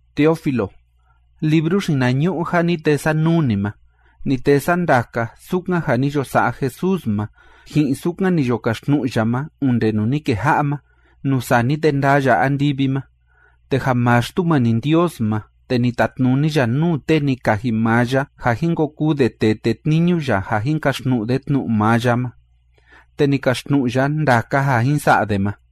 Teófilo, libru xinañu'u ja ni tee sa nuu ni ma, ni tee sa ndaka sukan ja ni yo sa'a Jesús ma, ji'in sukan ni yo kaxtnu'u ya ma, onde nuu ni keja'a ma, nuu sani te ndaa ya andivi ma. Te ja maa Xtumani Ndios ma, te ni tatnuni ya nuu tee ni kaji maa ya ja jin ko kuu de tee tetniñu ya ja jin kaxtnu'u de tnu'u maa ya ma, te ni kaxtnu'u ya ndaka ja jin sa'a de ma.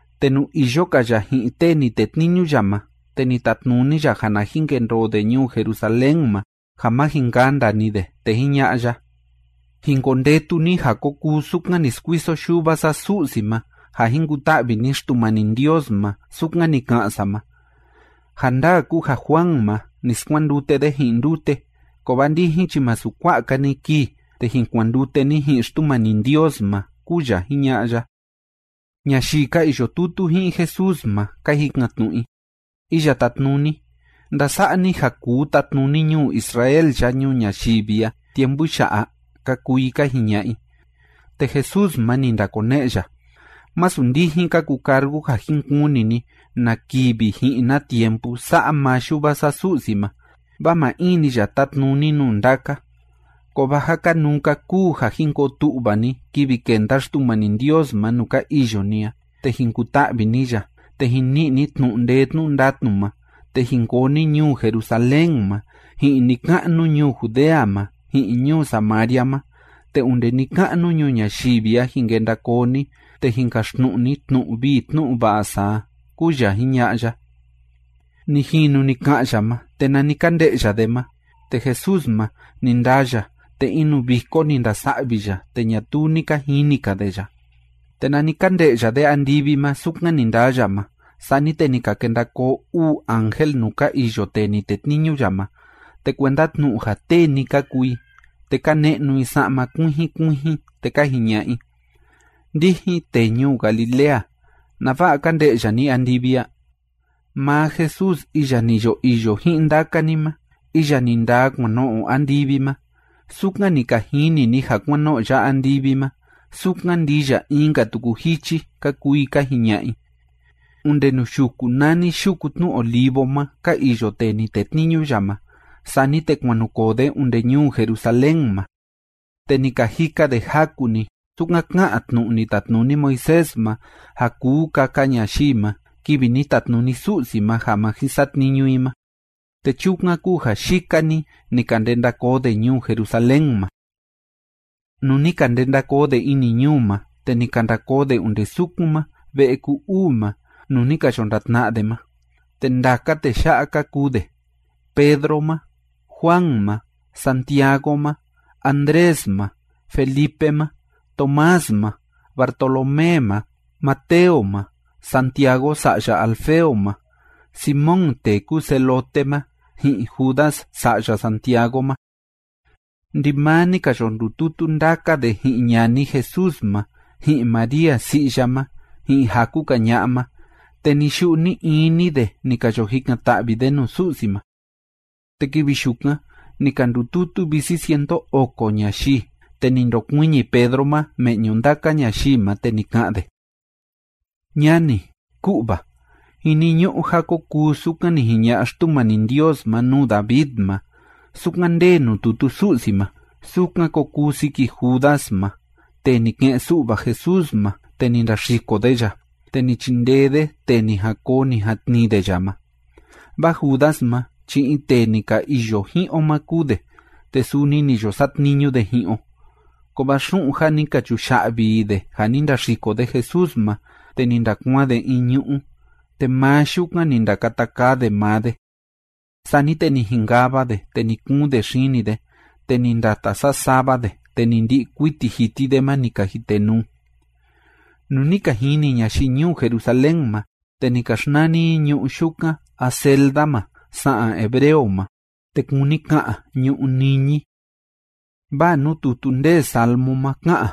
Te nuu iyo‑ka ya ji'in tee ni tetniñu ya ma, te ni tatnuni ya ja na jin kendoo de ñuu Jerusalén ma, ja má jin kanda‑ni de, te jiña'a ya: ―Jin kondetu ni ja ko kuu sukan ni skuiso Yuva sa Su'si ma ja jin kuta'vi ni Xtumani Ndios ma, sukan ni ka'an sa ma. Ja ndaa kúu ja Juan ma, ni skuandute de ji'in ndute, kovaa ndijin chi masu kua'a‑ka‑ni kii, te jin kuandute ni ji'in Xtumani Ndios ma ―kúu ya jiña'a ya. Ñayii ka iyo tutu ji'in Jesús ma, ka jikan‑tnu'u i: ―Iya Tátnuni, ¿ndasa'a ni ja kuu tatnuni ñuu Israel ya ñuu ñayivi a tiempu ya'a? ―ka kuu i ka jiña'a i. Te Jesús ma, ni ndakone'e ya: ―Masu ndijin ka kucargu ja jin kuni ni na kivi ji'in na tiempu sa'a maa Yuva sa Su'si ma, vaa maa in‑ni ya tátnuni nuu ndaka. Kovaa ja kanuu‑ka kúu ja jin koo tu'va ni kivi kenda Xtumani Ndios ma nuu ka iyo ni a, te jin kuta'vi ni ya, te jin ni'i ni tnu'u ndee tnu'u ndatnu ma, te jin koo ni ñuu Jerusalén ma, ji'in ni‑ka'nu ñuu Judea ma, ji'in ñuu Samaria ma, te onde ni‑ka'nu ñuu ñayivi a jin kenda koo ni, te jin kaxtnu'u ni tnu'u vii tnu'u va'a sa a ―kúu ya jiña'a ya. Ni jinu ni ka'an ya ma, te nani ka nde'ya de ma, te Jesús ma, ni ndaa ya, te in nuu viko ni ndasa'vi ya, te ñatuu ni ka jini‑ka de ya. Te nani ka nde'ya de andivi ma sukan ni ndaa ya ma, sani te ni ka kenda koo uu ángel nuu ka iyo tee ni tetniñu ya ma, te kuenda tnu'u ja tee‑ni ka kuu i, te ka ne'nu i sa'ma kuijin kuijin, te ka jiña'a i: ―Ndijin tee ñuu Galilea, ¿nava'a ka nde'ya ni andivi a? Maa Jesús iya ni yo iyo ji'in ndaka ni ma, iya ni ndaa kuan no'o andivi ma, sukan ni ka jini ni ja kuan no'o ya andivi ma, sukan ndii ya in‑ka tuku jichi ―ka kuu i ka jiña'a i. Onde nuu yuku nani Yuku Tnu Olivo ma ka iyo tee ni tetniñu ya ma. Sani te kuan nu koo de onde ñuu Jerusalén ma, te ni ka jika de jaku‑ni, sukan ká'an tnu'u ni tatnuni Moisés ma ja kuu kaka ñayii ma kivi ni tatnuni Su'si ma ja ma jin satniñu i ma, te chukan kúu ja yika‑ni ni ka ndenda koo de ñuu Jerusalén ma. Nuu ni ka ndenda koo de ini ñuu ma, te ni ka nda koo de onde sukun maa ve'e ku‑uu ma nuu ni ka yo ndatna'a de ma. Te ndaka tee ya'a ka kuu de: Pedro ma, Juan ma, Santiago ma, Andrés ma, Felipe ma, Tomás ma, Bartolomé ma, Mateo ma, Santiago sa'ya Alfeo ma, Simón tee kúu Celote ma, ji'in Judas sa'ya Santiago ma. Ndimaa ni ka yo ndututu ndaka de ji'in ñani Jesús ma, ji'in María si'i ya ma, ji'in jaku‑ka ña'a ma, te ni‑yu'u ni‑ini de ni ka yo jikan‑ta'vi de nuu Su'si ma. Te kivi yukan ni ka ndututu visi cientu oko ñayii. Te ni ndokuiñi Pedro ma me'ñu ndaka ñayii ma, te ni ka'an de: ―Ñani, ku'va, jiniñu'u ja ko kuu sukan ni jiña'a Xtumani Ndios ma nuu David ma, sukan ndee nuu tutu Su'si ma, sukan ko kuu siki Judas ma tee ni ke'en‑su'va Jesús ma, te ni ndaxiko de ya, te ni chindee de tee ni jan koo ni jan tnii de ya ma. Vaa Judas ma chi in tee ni ka iyo ji'in o ma kúu de, te suni ni yo satniñu de ji'in o. Kovaa xu'un ja ni ka chuya'vi i de ja ni ndaxiko de Jesús ma, te ni ndakuaan de in ñu'ú, te maa yukan ni ndakata kaa de maa de. Sani te ni jinkava de, te ni kuun de xini de, te ni ndata sasava de, te ni ndi'i kuiti jiti de ma ni ka jitenuu. Nuu ni ka jini ñayii ñuu Jerusalén ma, te ni ka xnani i ñu'ú yukan Aceldama sa'an hebreo ma, te kúni ka'an “Ñu'ú Niñi”. Vaa nuu tutu ndee Salmo ma ká'an: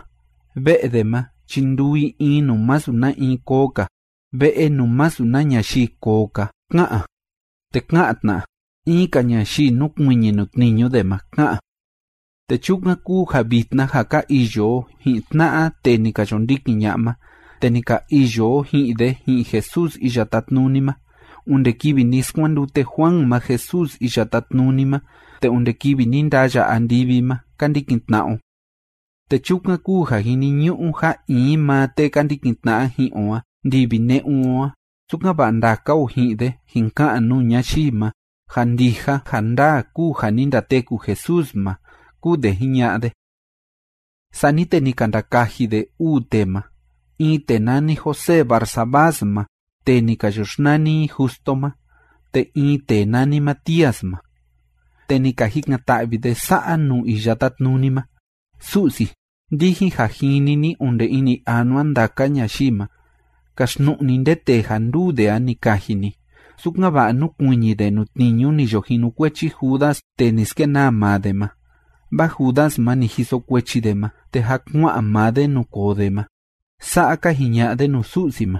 Ve'e de ma chi nduu i in nuu masu na in koo‑ka, ve'e nuu masu na ñayii koo‑ka, ká'an, te ka'an tna: in‑ka ñayii nukuiñi nuu tniñu de ma, ká'an. ’Te chukan kúu ja vitna ja ka iyo o ji'in tna'a tee ni ka yo ndikin ña'a ma, te ni ka iyo o ji'in de ji'in Jesús Iya Tátnuni ma onde kivi ni skuandute Juan ma Jesús Iya Tátnuni ma, te onde kivi ni ndaa ya andivi ma ka ndikin tna'a o. Te chukan kúu ja jiniñu'u ja in maa tee ka ndikin tna'a ji'in o a ndivi ne'un o a, sukan‑va'a ndaka o ji'in de jin ka'an nuu ñayii ma ja ndija ja ndaa kúu ja ni ndateku Jesús ma ―kúu de jiña'a de. Sani te ni ka ndakaji de uu tee ma. In tee nani José Barsabás ma tee ni ka yo xnani i Justo ma, te in tee nani Matías ma. Te ni ka jikan‑ta'vi de sa'a nuu Iya Tátnuni ma: ―Su'si, ndijin ja jini ni onde ini anua ndaka ñayii ma, kaxtnu'u ni nde tee ja nduu de a ni kaji ni, sukan‑va'a núkuiñi de nuu tniñu ni yo jinukuechi Judas tee ni skenaa maa de ma. Vaa Judas ma, ni jiso kuechi de ma, te jâ kua'an maa de nuu koo de ma. ―Sa'a ka jiña'a de nuu Su'si ma.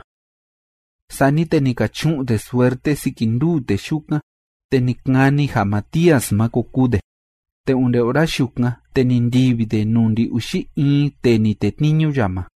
Sani te ni ka chu'un de suerte siki nduu tee yukan, te ni kani ja Matías ma ko kuu de. Te onde ora yukan, te ni ndivi de nuu ndi‑uxi in tee ni tetniñu ya ma.